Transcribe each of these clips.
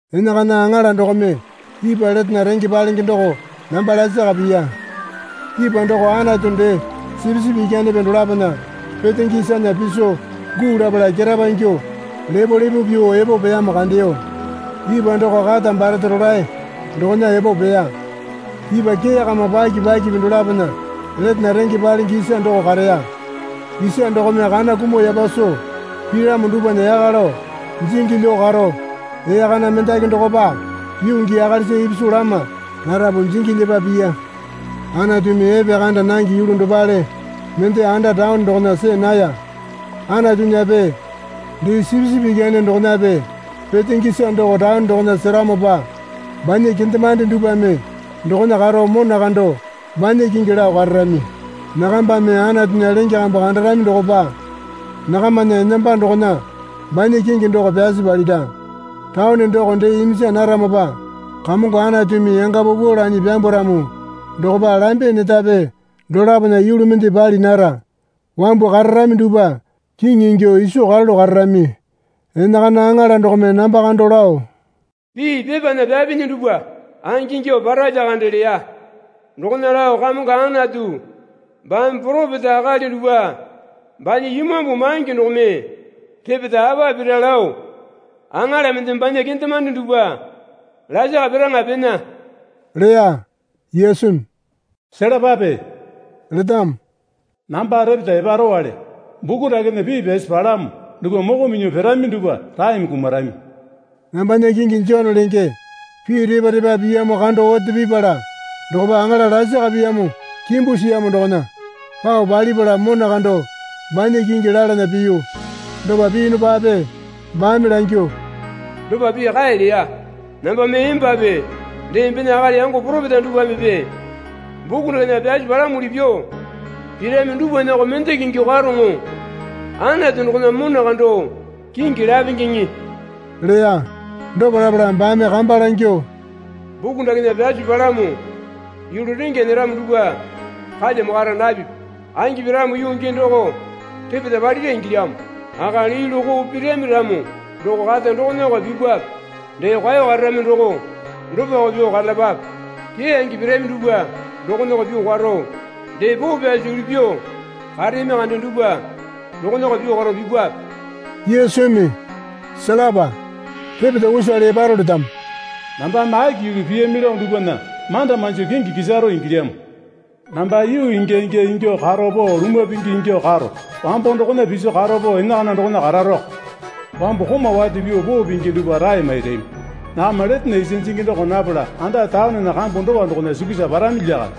Enakana aŋala dokome ipwa letena renge palenge doko namba lasaka piya. Ipwa doko Anatu dee Sipisipi Ikyanepe dolapona petenge isana piso guu lapala ketapa ingyuo lepolepo pyuo epo peyamo kandeyo. Ipwa doko kata barete rolae dokona epo peya. Ipwa kee kama paki pakipi dolapona letena renge palenge isa doko kareya. Isa dokome kana kumuo yapa soo piramo dupwana yaka lao jingi lyuo karo ee kana mendaki dokopa yuu gii akalisa ipisu lama larapu jingi lyepa piya. Anatumi epekanda nange yulu dopale mende anda taone dokona see naya. Anatunyape dee Sipisipi Ikyane dokonape petenge isa doko taone dokona seramopa banya kendemande dupwame dokona karo mona kando banya kingi lao kararami. Nakambame Anatunya lenge kambu kandarami dokopa nakamana enamba dokona banya kingi doko pyasi palira. Taone doko dee iminja naramopa Kamongo Anatumi yanga paupau lanyi pyambwaramo dokopa lambe netape dolapona yulu mende pali nara. Wambu kararami dupwa kiŋi ingyuo iso karalu kararami. Enakana aŋala dokome namba kando lao, Pii pepana pyapinyi dupwa angingyuo para lyakande leya. Dokona lao Kamongo Anatu baame poropeta akali dupwa banya Imambu maingi dokome repeta apa pira lao aŋala mendeme banya kendemande dupwa lasaka piraŋa pena leya. Yesumi, Selapape letamo. Namba repeta eparowale. Buku dakena pii pyasi palamo dupwa moko minyuo pirami dupwa raeme kumarami. Nambana kingi Jone lenge. Pii repa repa piyamo kando ote pipala dokopa aŋala lasaka piyamo kimbu siyamo dokona pao palipala mona kando banya kingi lalana piyu. Dopa piyunupape baame langyuo, Dopa pii kae leya. Namba mee embape dee embena akali yango poropeta dupwamepe buku dakena pyasi palamuli pyuo pirami dupwanako mendaki ingyuo karoŋo. Anatu dokona mona kando kingi lapengeŋe leya. Dopa lapala baame kamba langyuo, Buku dakena pyasi palamo yulu rengya nyeramo dupwa kalyamo kara napipi. Angi piramo yuu gii doko repeta palira ingilyamo. Akali yulu koo pirami ramo doko kata dokonako pipape. Dee kwao kararami doko dopako pyuo karalapape. Keyange pirami dupwa dokonako pyuo karo. Dee poo pyasi yulu pyuo kareyami kande dupwa dokona pyuo karo pipape. Yesumi, Selapa, repeta usale eparo letamo. Nambame aki yulu piyami lao dupwana manda manjo kingi kisaro ingilyamo. Namba yuu ingya ingya ingyuo karo pao lumwa pingi ingyuo karo wambo dokona piso karo pao enakana dokona kararoko. Wambu komau wate pyuo poo pingi dupwa rae mairami. Nakama letena isa jingi doko napala anda taonena kambu dowa dokona sukusa parami lyakande.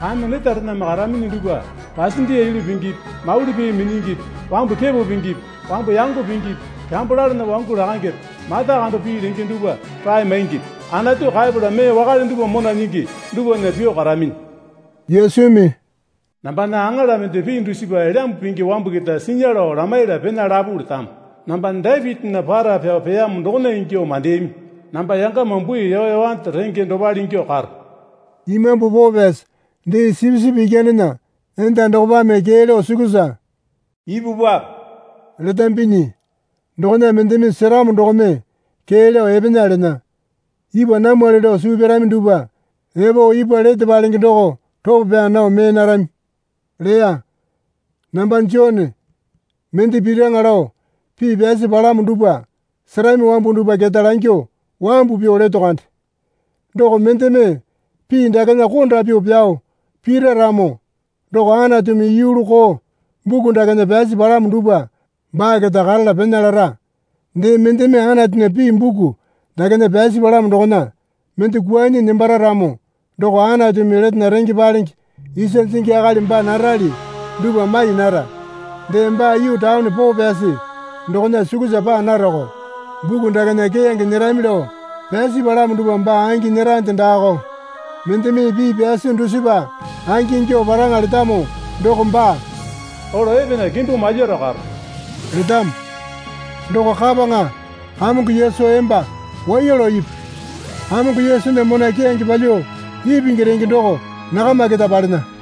Kame netarename karaminyi dupwa pasendiya yulu pingipi mauli pee minyingipi wambu kepo pingipi wambu yango pingipi kyambo lalana wangu lakangepe mata kando pii lenge dupwa rae maingipi Anatu kaepala mee wakale dupwa mona nyingi dupwana pyuo karaminyi. Yesumi, Nambana aŋala mende pii dusipa Elyambu Pingi wambu keta sinya lao lamaiyala pena lapu letamo. Namba Dapitinya para pyao peyamo dokona ingyuo mandeyami. Namba yangama bui yoyowande renge dopale ingyuo karo. Imambu Poo Pyasi dee Sipisipi Ikyanena enda dokopame kee lao sukusa ipupwape letambinyi. Dokona mendeme seramo dokome kee lao epena lena. Ipwa namwali lao suu pyarami dupwa epo ipwa lete palenge doko ropo pyaa nao mee narami leya. Namba Jone, mende piraŋa lao pii pyasi palamo dupwa serami wambu dupwa keta langyuo wambu pyuo leto kande. Doko mendeme pii dakena konda pyuo pyao pira ramo doko Anatumi yulu koo buku dakena pyasi palamo dupwa baa keta karala pena lara. Dee mendeme Anatunya pii buku dakena pyasi palamo dokona mende kwuanyi nembara ramo doko Anatumi letena renge palenge isa jingi akali baa narali dupwa mai nara. Dee baa yuu taone poo pyasi dokona sukusa paa narako. Buku dakena keyange nyerami lao pyasi palamo dupwa baa angi nyerande daako. Mendeme pii pyasi dusipa angingyuo paraŋa letamo doko baa, Olo epena kimbu malyaro karo letamo. Doko kapaŋa Kamongo Yesu emba waiya lao ipu. Kamongo Yesunya mona keyange palyuo ipingi renge doko nakama keta palena.